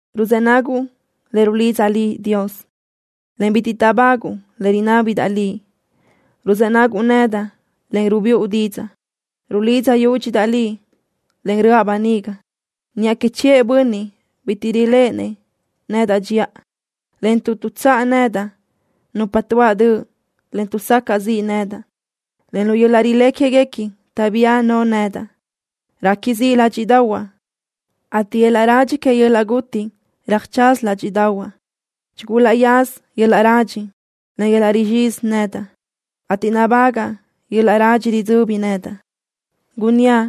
Ruzë́ naguʼ le rulidzaʼ Liʼ, Dios, en bitiʼ táʼbaguʼ le rinábidaʼ Liʼ. Ruzë́ naguʼ nedaʼ, en rubíʼu didzaʼ. Rulidza yúdxidaʼ Liʼ, en röʼa böniga niʼa que chiʼë bönniʼ bitiʼ riléʼenëʼ nedaʼ dxiʼa, en tuʼ tuʼtsáʼ nedaʼ nupa tuáʼ döʼ, en tuʼsacaʼ ziʼ nedaʼ, en lu yöl-laʼ rilé quéguequi taʼbía no nedaʼ. Réqui ziʼ ládxiʼdaʼahuaʼ, ateʼ yöl-laʼ radxi que yöl-laʼ guti röjtsaza ládxiʼdaʼahuaʼ. Chigulaʼyaza yöl-laʼ radxi, en yöl-laʼ rizxizi nedaʼ, ateʼ nabagaʼ yöl-laʼ radxi ridzöbi nedaʼ. Gunníaʼ: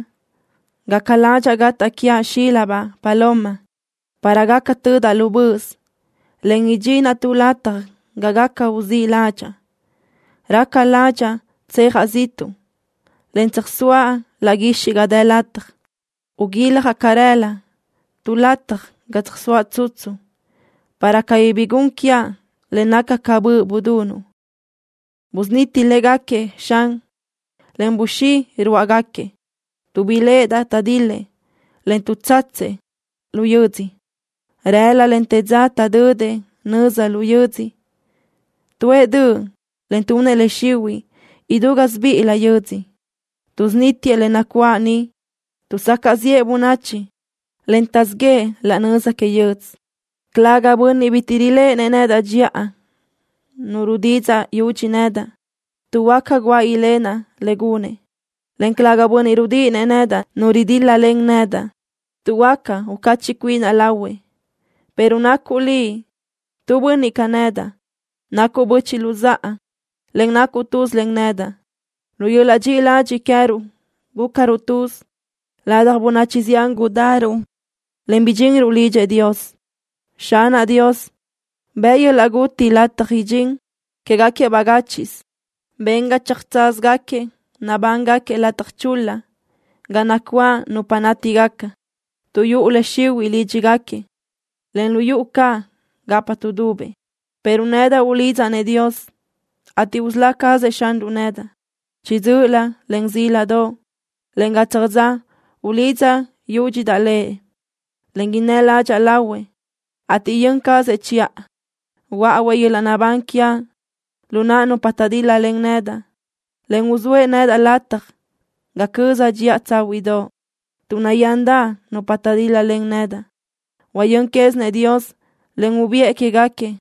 “Gaca ládxaʼa gataʼ quiaʼ xílabaʼ guʼdödoʼ, para gaca tödaʼ lu böʼös, en idxinaʼ tu lataj ga gaca uzíʼ ládxaʼa. Raca ládxaʼa tsejaʼ ziʼtuʼ, en tsöjsóaʼ laʼ guixiʼ ga dë lataj. Uyijaʼ carelö tu lataj ga tsöjsóaʼ tsutsu, para cabí bi gun quiaʼ le naca ca böʼ budunuʼ.” Busuniti légaquiëʼ, Xan, en buxí ruáʼagaquiëʼ, tuʼ biléʼedaʼ taʼdil-lëʼ, en tuʼtsatsëʼ lu yödzö. Rëla, en te dza taʼdödëʼ nöza lu yödzö. Tuʼë döʼ, en tunëʼ le xihuiʼ idú gásibiʼilö yödzö. Tuʼsunítiëʼ le nacuáʼ niʼ. Tuʼsacaʼ ziʼë bönachi, en taʼzíʼ yëʼë laʼ nöza que yödz. Calëga bönniʼ bitiʼ riléʼenëʼ nedaʼ dxiʼa nu rudidzaʼ yudxi nedaʼ, tuʼ huáca guáʼ ilenaʼ le gunëʼ, en calëga bönniʼ rudíʼinëʼ nedaʼ nu ridíl-lalen nedaʼ, tuʼ huáca ucachiʼ cuinaʼ lahuëʼ, pero nacuʼ liʼ, tu bönniʼ ca nedaʼ. Nacuʼ böchiʼ luzáʼa, en nacuʼ tuz len nedaʼ. Lu yöl-laʼ dxiʼi ladxiʼ queë́ruʼ gúcaruʼ tuz. Ladaj bönachi zián gudaruʼ, en bidxinruʼ lidxëʼ Dios. Xanaʼ Dios, bëʼ yöl-laʼ guti lataj idxín quégaquiëʼ bagáchiʼsö. Ben ga tsöjtsázagaquiëʼ nabángaquiëʼ lataj chul-la ga nacuáʼ nupa nátigaca, tuʼ yuʼu le xihuiʼ lídxigaquiëʼ, en lu yuʼu caʼ gapa tuʼdubëʼ. Pero nedaʼ ulidzaʼ-nëʼ Dios, ateʼ usölá cazëʼ Xanruʼ nedaʼ. Chiʼi dzö́ʼölö, en zíladoʼ, en gatsaj dza ulidza yúdxidaʼ Lëʼ, en innë́ ládxaʼa lahuëʼ, ateʼ yön cazëʼ chiʼa. Huöáʼuëʼ yöl-laʼ naʼbán quiaʼ lu naʼ nupa taʼdíl-lalen nedaʼ en uzóëʼ nedaʼ lataj ga cözaʼ dxiʼa tsáhuiʼdoʼ, tuʼ nayándaʼ nupa taʼdíl-lalen nedaʼ. Huayö́n quézinëʼ Dios, en ubiʼë quégaquiëʼ.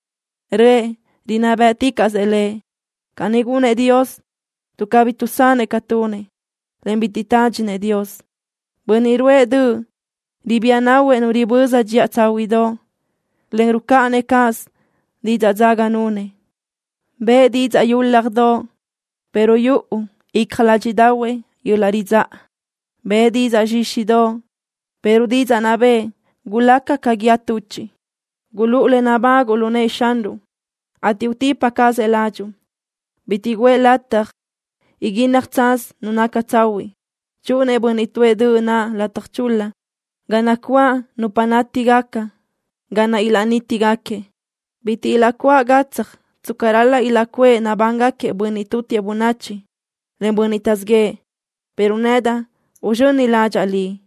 Röʼë rinná bë́ʼticaʼsëʼ Lëʼ. Caní gunëʼ Dios tuʼ cabí tuʼsanëʼ ca tunëʼ, en bitiʼ tádxinëʼ Dios. Bönniʼ ruʼë döʼ ribía nahuëʼ nu riböza dxiʼa tsáhuiʼdoʼ, en rucáʼanëʼ cáʼasö didzaʼ dzaga nunëʼ. Bëʼë didzaʼ yúladoʼ, pero yuʼu icja ládxiʼdaʼahuëʼ yöl-laʼ ridzáʼa. Bëʼë didzaʼ zxíxidoʼ, pero didzaʼ naʼ bëʼë gulaca ca guíë tuchiʼ. Gulúʼu le nabáguʼu lu nëʼë Xanruʼ, ateʼ utipa cazëʼ ládxuʼu. Bitiʼ guʼë lataj iguínnaj tsaz nu naca tsahuiʼ. Chúʼunëʼ bönniʼ tuʼë döʼ naʼ lataj chul-la ga nacuáʼ nupa nátigaca ga naʼ ilaʼnítigaquiëʼ. Bitiʼ ilaʼcuáʼ gatsaj tsca ral-laʼ ilaʼcuʼë nabángaquiëʼ bönniʼ tutiëʼ bönachi, en bönniʼ taʼzíʼ yëʼë. Pero nedaʼ uzxöni ládxaʼa Liʼ.